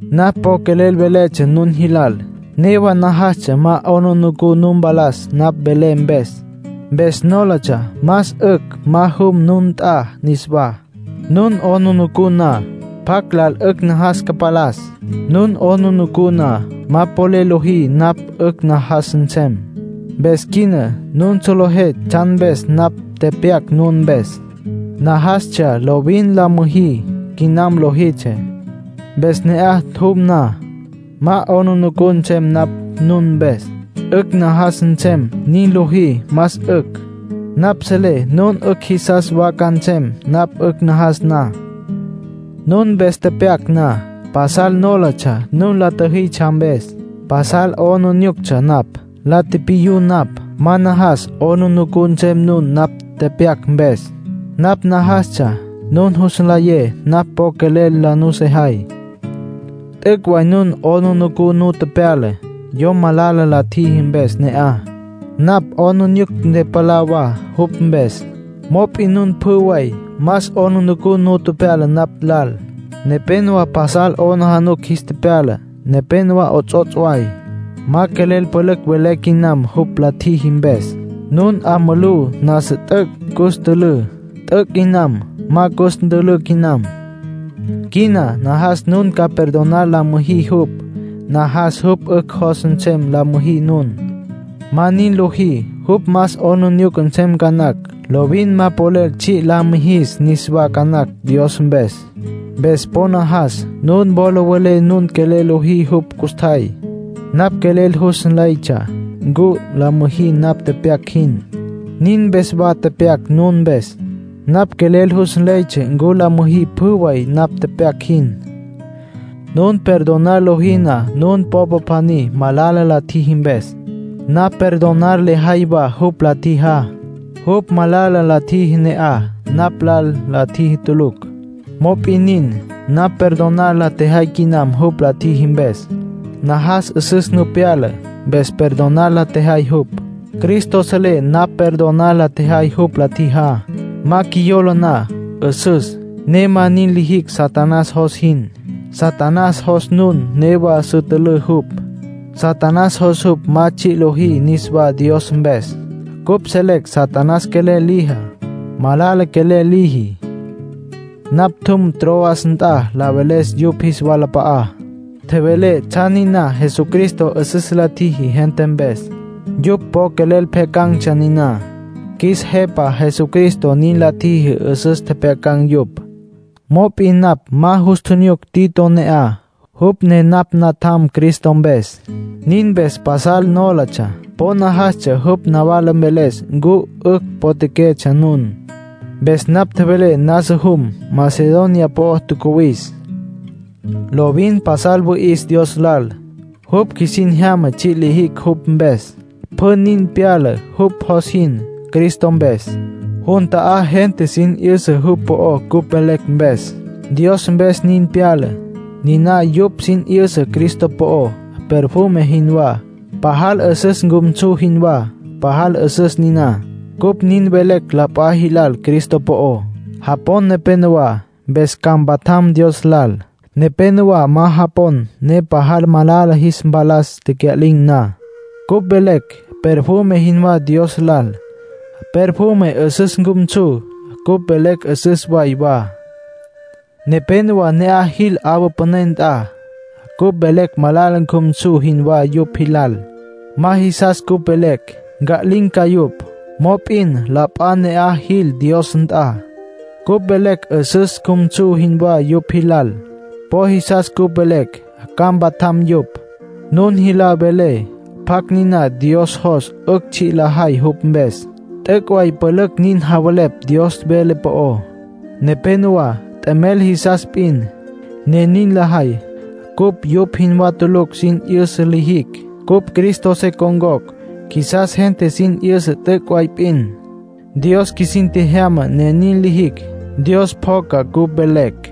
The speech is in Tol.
Napj po quelel veletsja nun jilal. Newa najastsja ma 'aplijila nu mpalas napj velé mpes. Mpes nólatsja más 'ücj ma jum nun nt'a niswá. Nun 'aplijila na, ¿pjacj lal 'ücj najas ca mpalas? Nun 'aplijila na, ma polel lojí napj 'ücj najas nsem. Mpes quina nun solejé tsjan mpes napj tepyac nun mpes. Najastsja lovin ma la müjí quinam lojitsjé. Mpes ne'aj jum na, ma ca 'aplijila nsem napj nun mpes. 'Ücj najas nsem nin lojí, más 'ücj. Napj selé nun 'ücj jisas wa ca nsem napj 'ücj najas na. Nun mpes tepyac na, pasal nólatsja nun la tjüjitsja mpes. Pasal 'aplijílatsja napj. La tipiyú napj. Ma najastsja 'aplijila nsem nun napj tepyac mpes. Napj najastsja nun jus nlayé napj po quelel la nusejay. T'üc' way nun 'aplijila nu tepyala, yom malala la tjiji mpes ne'aj. Napj 'aplijila ntepalá wa jupj mpes, mop'in nun pjü way más 'aplijila nu tepyala napj lal. Nepénowa pasal 'aplijila jis tepyala, nepénowa 'ots'ots' way. Ma quelel pülücj velé quinam jupj la tjiji mpes. Nun 'a mulú nasa t'üc' cus tülǘ. T'üc' quinam. Ma cus ntülǘ quinam. Quina najas nun ca perdonar la müjí jupj. Najas jupj 'ücj jos nsem la müjí nun. Ma nin lojí, jupj más 'aplijila nsem ca nacj, lovin ma polel tsji' la mijis niswá ca nacj Dios mpes. Mpes po najas nun wola welé nun quelel lojí jupj custjay. Napj quelel jus nleytsja ncu la müjí napj tepyac jin; nin mpes wa tepyac nun mpes. Napj quelel jus nleytsja ncu la müjí pjü way napj tepyac jin. Nun perdonar lojí na nun popa pjaní, malala la tjiji mpes, napj perdonar lejay wa jupj la tjijá. Jupj malala la tjiji ne'aj, napj lal la tjiji tulucj. Mop'in nin, napj perdonar la tjejay quinam jupj la tjiji mpes. Najas 'üsüs nu pyala, mpes perdonar la tjejay jupj. Cristo selé napj perdonar la tjejay jupj la tjijá. Ma qjuiyola na, 'üsüs, ne ma nin lijicj Satanás jos jin. Satanás jos nun newa su tülǘ jupj. Satanás jos jupj ma tsji' liji niswá Dios mpes. Cupj selecj Satanás quelel lijá; malala quelel liji. Napj tjum Troas nt'a la veles yupj jis walap'a'á; tjevelé tsjan niná Jesucristo 'üsüs la tjiji gente mpes. Yupj po quelel pjyacan̈tsja niná; qjuis Jepa Jesucristo nin la tjiji 'üsüs tjepjyacan̈ yupj. Mop'in napj ma jus tjinyuc Tito ne'aj, jupj ne napj natjam Cristo mpes; nin mpes pasal nólatsja. Po najastsja jupj nawala mveles ncu 'ücj potjaquetsja nun. Mpes napj tjevelé nasa jum; Macedonia po'o tjacuwis. Lovin pasal wüi'is Dios lal. Jupj qjuisin jyama tsji' lijicj jupj mpes. Pjü nin pyala jupj jos jin, Cristo mpes. Jun ta'á gente sin 'yüsa jupj po'ó cupj velecj mpes; Dios mpes nin pyala. Niná yupj sin 'yüsa Cristo po'ó, perfume jinwá, pajal 'üsüs cjumsu jinwá; pajal 'üsüs niná. Cupj nin velecj la p'a jilal Cristo po'ó. Japon nepenowá, mpes ca mpatjam Dios lal. Nepénowa ma japon, ne pajal malala jis mpalas tecya'lin̈ na. Cupj velecj perfume jinwá Dios lal. Perfume 'üsüs cjumsu, cupj velecj 'üsüs way wa. Nepénowa ne'aj jil 'awa püné nt'a. Cupj velecj malala cjumsu jinwá yupj jilal. Ma jisas cupj velecj. Nca'lin̈ ca yupj. Mop'in la p'a ne'aj jil Dios nt'a. Cupj velecj 'üsüs cjumsu jinwá yupj jilal. Po jisas cupj velecj. Ca mpatjam yupj. Nun jilal velé pjacj niná Dios jos 'ücj tsji' lajay jupj mpes. T'üc' way pülücj nin javelepj Dios vele po'ó. Nepénowa t'emel jisas p'in, ne nin lajay. Cupj yupj jinwá tulucj nin sin 'yüsa lijicj. Cupj Cristo se con̈cocj. Qjuisas gente sin 'yüsa t'üc' way p'in. Dios qjuisin tjejyama ne nin lijicj. Dios pjoca cupj velecj.